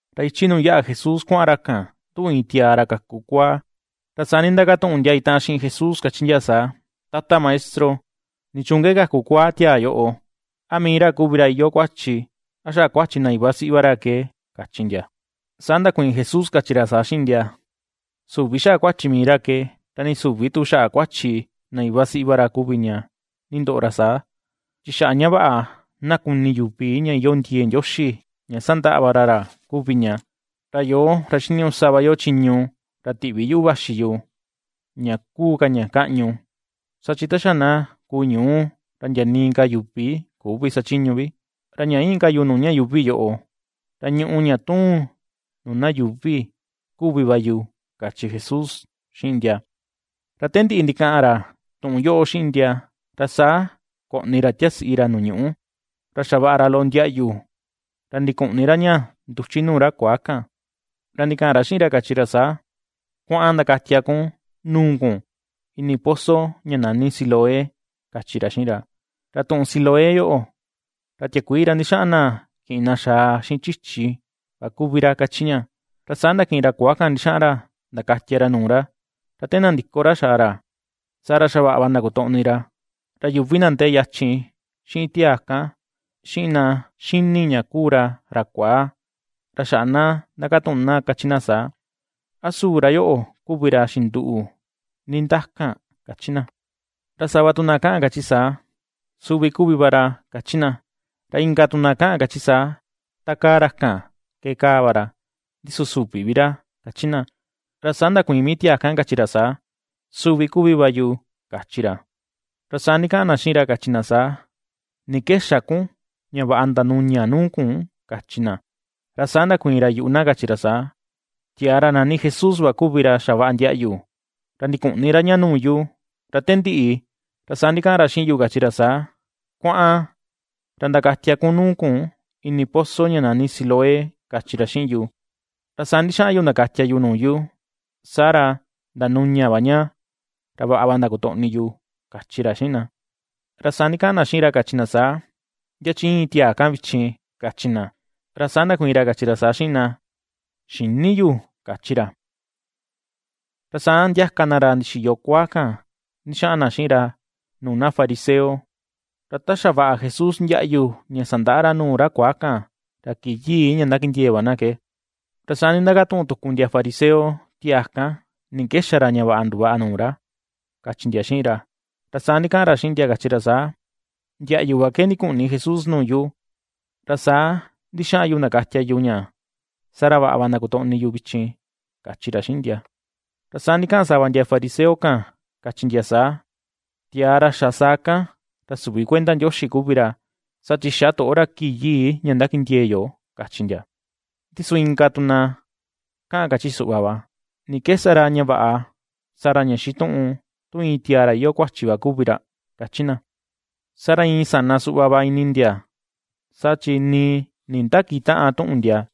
Ra ichi nuu yaꞌa Jesús kuaꞌan ra kan, nduꞌu iin tiaa ra kaku kuaa. Ra saa ndindakatuꞌun ndia itaꞌan xiꞌin Jesús kachi ndia saa: ―Tata Maestro, ¿nichuun ke kaku kuaa tiaa yoꞌo? ¿A mii ra kuvi ra iyoo kuachi? ¿A xaꞌa kuachi na iva siꞌi va ra ke? ―kachi ndia. Saa ndakuiin Jesús kachi ra saa xiꞌin ndia: ―Süvi xaꞌa kuachi mii ra ke, ra nii süvi tu xaꞌa kuachi na iva siꞌi ra kuvi ña nindoꞌo ra saa, chi xaꞌa ña vaꞌa na kuni yuvi ña iyoo ndiee Ndioxi ña sandaꞌa va ra ra kuvi ña. Ra yoo, ra xiniñuꞌu sa va yo chiñu ra tiꞌvi yuꞌu vaxi yu, ña kuu ka ña kaꞌñu, saa chi ta xa na kuu ñuu ra ndia nii ka yuvi küvi sachiñu vi. Ra ña íin ka yu nuu ña yuuvi yoꞌo, ra ñuꞌu ña tuun nuu na yuuvi kuvi va yu ―kachi Jesús xiꞌin ndia. Ra te ndiꞌi ndikaꞌan ra tuꞌun yoꞌo xiꞌin ndia, ra saa koꞌni ra tiasiꞌi ra nuu ñuꞌu, ra xavaꞌa ra loꞌo ndiaꞌyu, ra ndikuꞌni ra ña nduchi nuu ra kuaa kan. Ra ndikaꞌan ra xiꞌin ra kachi ra saa: ―Kuaꞌan ndakatia kun nuu kun ini pozo ña nani Siloé ―kachi ra xiꞌin ra. ―Ra tuꞌun Siloé yoꞌo, ra tiakuii ra ndixaꞌan na kiꞌin na xaa xiꞌin chichi va kuvi ra ―kachi ña. Ra saa ndakiꞌin ra kuaa kan ndixaꞌan ra ndakatia ra nuu ra, ra te nandiko ra xaa ra, saa ra xa vaꞌa va ndakutoꞌni ra. Ra yuvi na ndee yachin xiꞌin tiaa kan, xiꞌin na ^xini ña kuu ra, ra kuaa, ra xaꞌa na ndakatuꞌun na kachi na saa: ―¿A su ra yoꞌo kuvi ra xinduꞌu ndindakan? ―kachi na. Ra sava tu na kaꞌan kachi saa: ―Suvi kuvi va ra ―kachi na. Ra inka tu na kaꞌan kachi saa: ―Takaa ra kan ke kaa va ra, ndi su süvi vi ra ―kachi na. Ra saa ndakuiin mii tiaa kan kachi ra saa: ―Suvi kuvi va yu ―kachi ra. Ra saa ndikaꞌan na xiꞌin ra kachi na saa: ―¿Ni ke xa kun ña vaꞌa ndanuña nuu kun? ―kachi na. Ra saa ndakuiin ra yuꞌu na kachi ra saa: ―Tiaa ra nani Jesús va kuvi ra xavaꞌa ndiaꞌyu, ra ndikuꞌni ra ña nuu yu, ra te ndiꞌi ra saa ndikaꞌan ra xiꞌin yu kachi ra saa: “Kuaꞌan, ra ndakatia kun nuu kun ini pozo ña nani Siloé”, kachi ra xiꞌin yu. Ra saa ndixaꞌan yu ndakatia yu nuu yu, saa ra ndanuña va ña ra vaꞌa va ndakutoꞌni yu ―kachi ra xiꞌin na. Ra saa ndikaꞌan na xiꞌin ra kachi na saa: ―¿Ndia chi íin tiaa kan vichin? ―kachi na. Ra saa ndakuiin ra kachi ra saa xiꞌin na: ―Xïni yu ―kachi ra. Ra saa ndiaka na ra ndixiyo kuaa kan ndixaꞌan na xiꞌin ra nuu na fariseo. Ra ta xavaꞌa Jesús ndiaꞌyu ña sandaꞌa ra nuu ra kuaa kan, ra kii yii ña ndakindee va na ke. Ra saa nindakatuꞌun tuku ndia fariseo tiaa kan, ni ke xa ra ña vaꞌa nduvaꞌa nuu ra kachi ndia xiꞌin ra. Ra saa ndikaꞌan ra xiꞌin ndia kachi ra saa: ―Ndiaꞌyu va ke ndikuꞌni Jesús nuu yu, ra saa ndixaꞌan yu ndakatia yu ña, saa ra vaꞌa va ndakutoꞌni yu vichin ―kachi ra xiꞌin ndia. Ra saa ndikaꞌan sava ndia fariseo kan kachi ndia saa: ―Tiaa ra xa saa kan ra süvi kuenda Ndioxi kuvi ra, saa chi xä toꞌo ra kii yii ña ndakindiee yo ―kachi ndia. Ndi su inka tu na kaꞌan kachi suꞌva va: ―¿Ni ke sa ra, ña vaꞌa sa ra ña xituꞌun, tu iin tiaa ra iyoo kuachi va kuvi ra? ―kachi na. Saa ra iin sana suꞌva va ini ndia saa chi nii nindakitäꞌan tuꞌun ndia.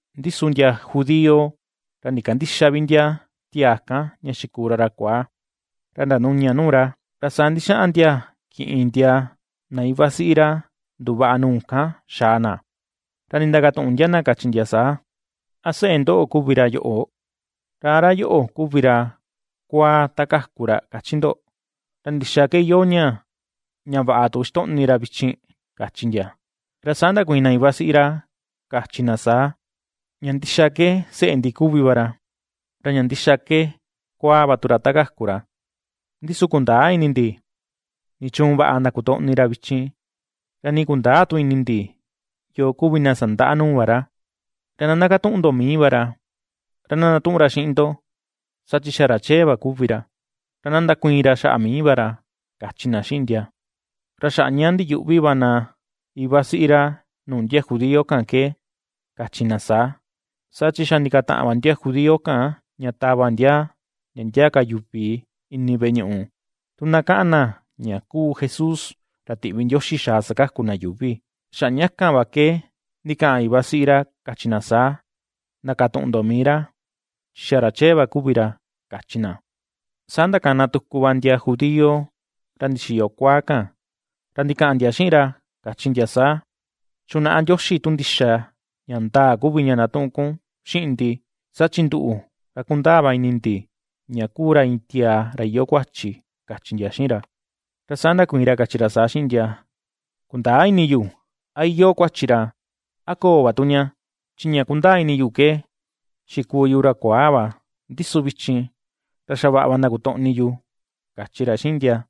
Ndi su ndia judío, ra ndikandïxa vi ndia tiaa kan ña xikuu ra ra kuaa, ra ndanuña nuu ra, ra saa ndixaꞌan ndia kiꞌin ndia, na iva siꞌi ra nduvaꞌa nuu kan xaa na. Ra nindakatuꞌun ndia na kachi ndia saa: ―¿A seꞌe ndoꞌo kuvi ra yoꞌo? ¿Ra a ra yoꞌo kuvi ra kuaa ta kaku ra kachi ndo? ¿Ra ndixaa ke iyoo ña, ña vaꞌa tu ixtoꞌni ra vichin? ―kachi ndia. Ra saa ndakuiin na iva siꞌi ra kachi na saa: ―Ña ndixa ke seꞌe ndi kuvi va ra, ra ña ndixa ke kuaa va tu ra ta kaku ra. Ndi su kundäa ini ndi nichuun vaꞌa ndakutoꞌni ra vichin, ra nii kundäa tu ini ndi yoo kuvi na sandaꞌa nuu va ra. Ra na ndakatuꞌun ndo mii va ra, ra na ndatuꞌun ra xiꞌin ndo, saa chi xa ra chee va kuvi ra, ra na ndakuiin ra xaꞌa mii va ra ―kachi na xiꞌin ndia. Ra xaꞌa ña ndiyuꞌvi va na iva siꞌi ra nuu ndia judío kan ke kachi na saa, saa chi xa ndikataꞌan va ndia judío kan ña tava ndia ndia ndia ka yuvi ini veꞌe ñuꞌu, tu na kaꞌan na ña kuu Jesús ra tiꞌvi Ndioxi xaa sakaku na yuuvi. Xaꞌa ña kan va ke ndikaꞌan iva siꞌi ra kachi na saa: “Ndakatuꞌun ndo mii ra, chi xa ra chee va kuvi ra”, kachi na. Saa ndakana tuku va ndia judío ra ndixiyo kuaa kan, ra ndikaꞌan ndia xiꞌin ra kachi ndia saa: ―Chunaꞌa Ndioxi tu ndixa ña ndaa kuvi ña ndatuꞌun kun xiꞌin ndi; saa chi nduꞌu, ra kundaa va ini ndi ña kuu ra iin tiaa ra iyoo kuachi ―kachi ndia xiꞌin ra. Ra saa ndakuiin ra kachi ra saa xiꞌin ndia: ―Kundäa ini yu a iyoo kuachi ra, a köo va tu ña, chi ña kundaa ini yu ke xikuu yu ra kuaa va, ndi su vichin ra xa vaꞌa ndakutoꞌni yu ―kachi ra xiꞌin ndia.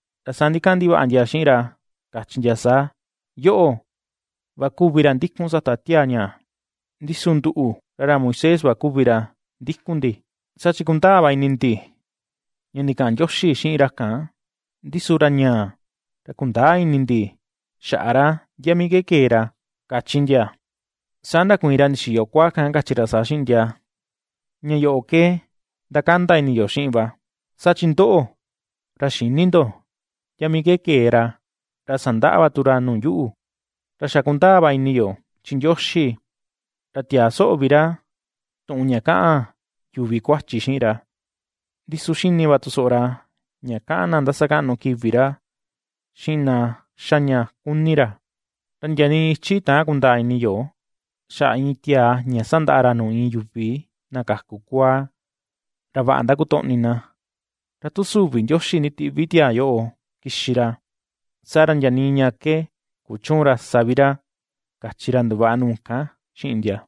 Ra saa ndikaꞌan ndivaꞌa ndia xiꞌin ra, kachi ndia saa: ―Yoꞌo va kuvi ra ndikun sata tiaa ñaa, ndi su nduꞌu, ra ra Moisés va kuvi ra ndikun ndi. Saa chi kundaa va ini ndi ña ndikaꞌan Ndioxi xiꞌin ra kan, ndi su ra ñaa ra kundäa ini ndi xaꞌa ra, ndia mii ke kee ra ―kachi ndia. Saa ndakuiin ra ndixiyo kuaa kan kachi ra saa xiꞌin ndia: ―¡Ña yoꞌo ke ndakanda ini yo xiꞌin va! Saa chi ndoꞌo, ra xïni ndo ndia mii ke kee ra, ra sandaꞌa va tu ra nuu yuꞌu. Ra xa kundaa va ini yo chi Ndioxi, ra tiäa soꞌo vi ra tuꞌun ña kaꞌan yuvi kuachi xiꞌin ra, ndi su xini va tu soꞌo ra ña kaꞌan na ndasakaꞌnu kivi ra xiꞌin na xa ña kuni ra. Ra ndia nii ichi täan kundaa ini yo, xaꞌa iin tiaa ña sandaꞌa ra nuu iin yuvi na kaku kuaa, ra vaꞌa ndakutoꞌni na. Ra tu süvi Ndioxi nditiꞌvi tiaa yoꞌo kixi ra, saa ra ndia nii ña ke kuchüun ra sa vi ra ―kachi ra nduvaꞌa nuu kan xiꞌin ndia.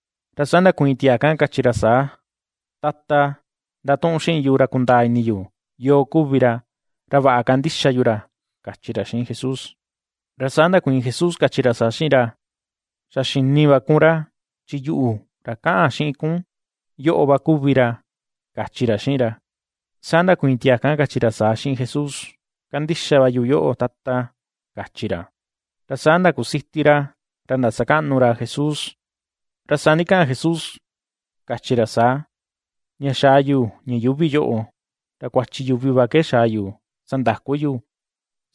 Ra saa ndakuiin tiaa kan kachi ra saa: ―Tata, ndatuꞌun xiꞌin yu ra kundaa ini yu yoo kuvi ra, ra vaꞌa kandixa yu ra ―kachi ra xiꞌin Jesús. Ra saa ndakuiin Jesús kachi ra saa xiꞌin ra: ―Xa xini va kun ra, chi yuꞌu ra kaꞌan xiꞌin kun yoꞌo va kuvi ra ―kachi ra xiꞌin ra. Saa ndakuiin tiaa kan kachi ra saa xiꞌin Jesús: ―Kandixa va yu yoꞌo, Tata, ―kachi ra. Ra saa ndakusiti ra ra ndasakaꞌnu ra Jesús. Ra saa ndikaꞌan Jesús kachi ra saa: ―Ña xaa yu ña yuuvi yoꞌo, ra kuachi yuvi va ke xaa yu sandaku yu;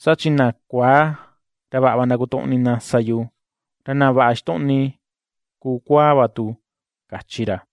saa chi na kuaa, ra vaꞌa va ndakutoꞌni na sa yu, ra na vaꞌa ixtoꞌni kuu kuaa va tu ―kachi ra.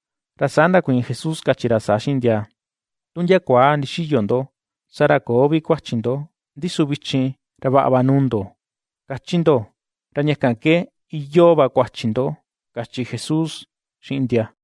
Ra saa ndakuiin Jesús kachi ra saa xiꞌin ndia: ―Tu ndia kuaa ndixiyo ndo, saa ra köo vi kuachi ndo, ndi su vichin ra vaꞌa va nuu ndo, kachi ndo, ra ña kan ke iyoo va kuachi ndo ―kachi Jesús xiꞌin ndia.